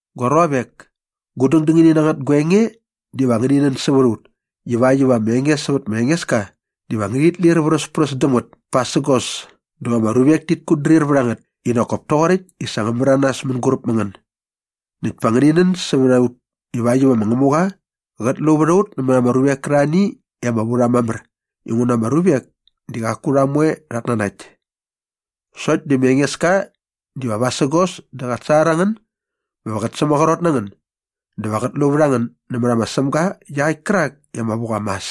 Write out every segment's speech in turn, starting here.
Gua ruavek, gu dängdängini na ngät gua enge diva ngäni nän sävät a ut ivakt iva ama enge sävät ma Engeska diva ngärhit lir vräspräs däm ngät pasägos dä va ama ruvek tit kutdrir vät a ngät i nak kop toqoräkt i sa ngä märanas mänguräp mä ngän. Näkt pa ngäni nän sävät a ut ivakt iva ma Ngämuqa qät lu vät a ut nämät ama ruvek kärarhani i ama vu rha mamär inguna ama ruvek di qaku rha moe rhat nanakt. Sokt di ma Engeska diva vasägos dä qat sangar a ngän bä va qä sämaqrot na ngän dä va qät lu vät a ngän nämät ma Sämga iaqäkt kärak i ama vu qa mas.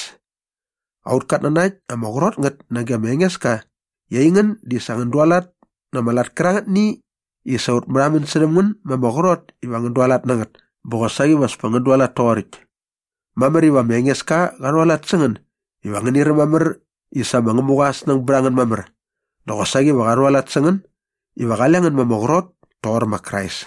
Aut katnanakt ama qrot ngät nage ma Engeska i aingän di sa ngän dualat na ama lat kärangätni i sa ut märhamän särhäm ngän ma ama qrot iva ngän dualat na ngät bä qosaqi va as pa ngän dualat toqoräkt. Mamär iva ma Engeska qa rhualat sä ngän iva ngäni räm mamär i sa ma Ngämuqa aa snäng bät a ngän mamär dä qosaqi va qa rhualat sä ngän iva qale ngän ma ama qrot toqor ma Krais.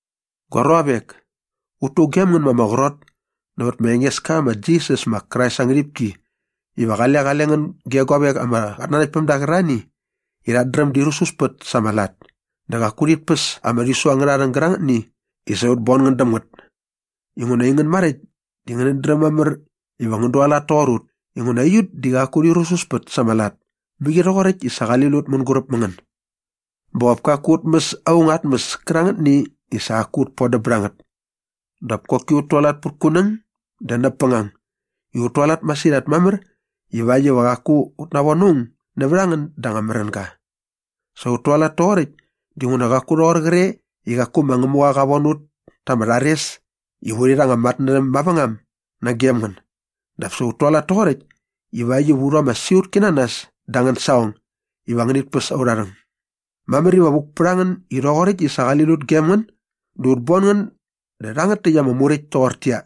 Gua ruavek, ut tugem ngän ma ama qrot nävät ma Engeska ma Jisas ma Krais aa ngärhipki iva qale qale ngän ge guavek ama qatnanaktpämda qärarhani i rhat dräm di rususpät sa ama lat dä qaku rhit päs ama rhisu angärha rhäng gärangätni i sa ut bon ngän däm ngät inguna aingän maräkt di ngänät dräm mamär iva ngän dualat toqor ut inguna aiut di qaku urhi rususpät sa ama lat mäqi rhoqoräkt i sa qali lut ut mänguräp mä ngän. Bä qop kaku ut mäs aung aa tmäs kärangätni i sa qaku ut bodäm bät a ngät. Dap koki ut tualat pät kunäng dä näp bängang i ut tualat masirhat mamär ivakt iva qaku ut navon aung nävät a ngän da anga märänga. Sa ut tualat toqoräkt dinguna qaku rhoqor qre i qaku ma Ngämuqa qa von ut ta ama rhares iva urhi rha anga matnärhäm mavängam nagem ngän dap sa ut tualat toqoräkt ivakt iva u rhu ama siqutki na nas da angän saqong iva ngänit päs aurha rhäng. Mamär iva vuk pät a ngän i rhoqoräkt i sa qali lut gem ngän dä ut bon ngän dä rhangät täkt ama muräkt toqortäqyia,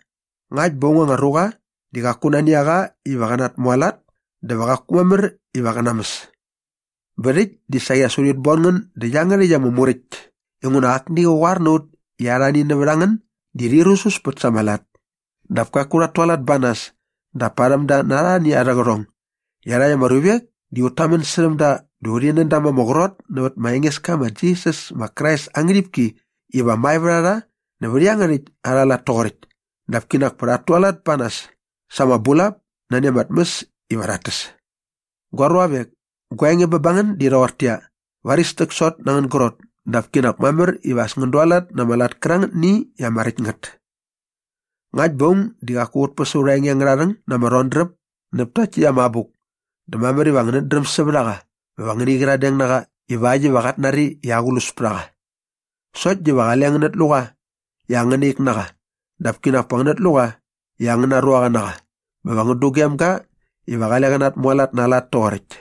ngakt bä aung anga ruqa di qaku nani a qa iva qä natmualat dä va qaku mamär iva qä namäs. Bä rhäkt di saqi as urhit bon ngän dä iangärhäkt ama muräkt inguna akni qa qoar na ut i arhani nävät a ngän di rhi rususpät sa ama lat. Dap kaku rhat tualat ba nas dap parhäm da na arhani arhä qärhong. Iarhakt ama ruvek di ut tamän särhäm da dä urhi nän da ma ama qrot nävät ma Engeska ma Jisas ma Krais aa ngärhipki iva mae vät a rha nävät iangärhäkt arha lat toqoräkt dap kinak pa rhat tualat ba nas sa ama bulap nani ama tmäs iva rhat täs. Gua ruavek, gua enge bä ba ngän di rhoqortäqyia, varis täksot na angän grot dap kinak mamär iva as ngän dualat na ama lat kärangätni i ama räkt ngät. Ngakt bä aung di qaku qät päs aurha enge angärha rhäng na ama rhodräp näp takt täkt ama abuk dä mamär iva ngänät dräm sävät a qa bä va ngäni qyiradeng na qa ivakt iva qat nari i aqlus pät a qa. Sokt diva qale ngänät lu qa i angäna ik na qa dap kinak pa ngänät lu qa i angäna ruaqa na qa bä va ngän dugem ga iva qale qä natmualat na aa lat toqoräkt.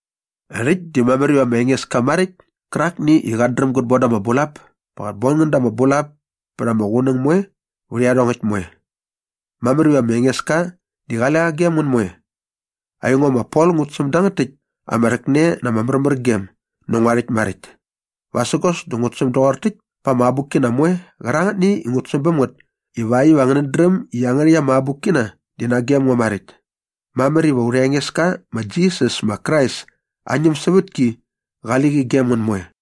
Rhäkt di mamär iva ma Engeska maräkt kärakni i qat dräm gät bon da ama bulap pa qät bon ngän da ama bulap pät ama qunäng moe vät iarhongäkt moe. Mamär iva ma Engeska di qale qa gem ngän moe. Aingo ma Pol ngut säm dangät täkt ama rhäkne na ama märmärgem nä ngua rhäkt maräkt. Vasägos dä ngut säm doqor täkt pä ama abukkina moe qärangätni i ngut säm bäm ngät ivakt iva ngänät dräm i iangärhäkt ama abukkina di nagem ngo maräkt. Mamär iva aurha Engeska ma Jisas ma Krais aa ñämsävätki qali qi gem ngän moe.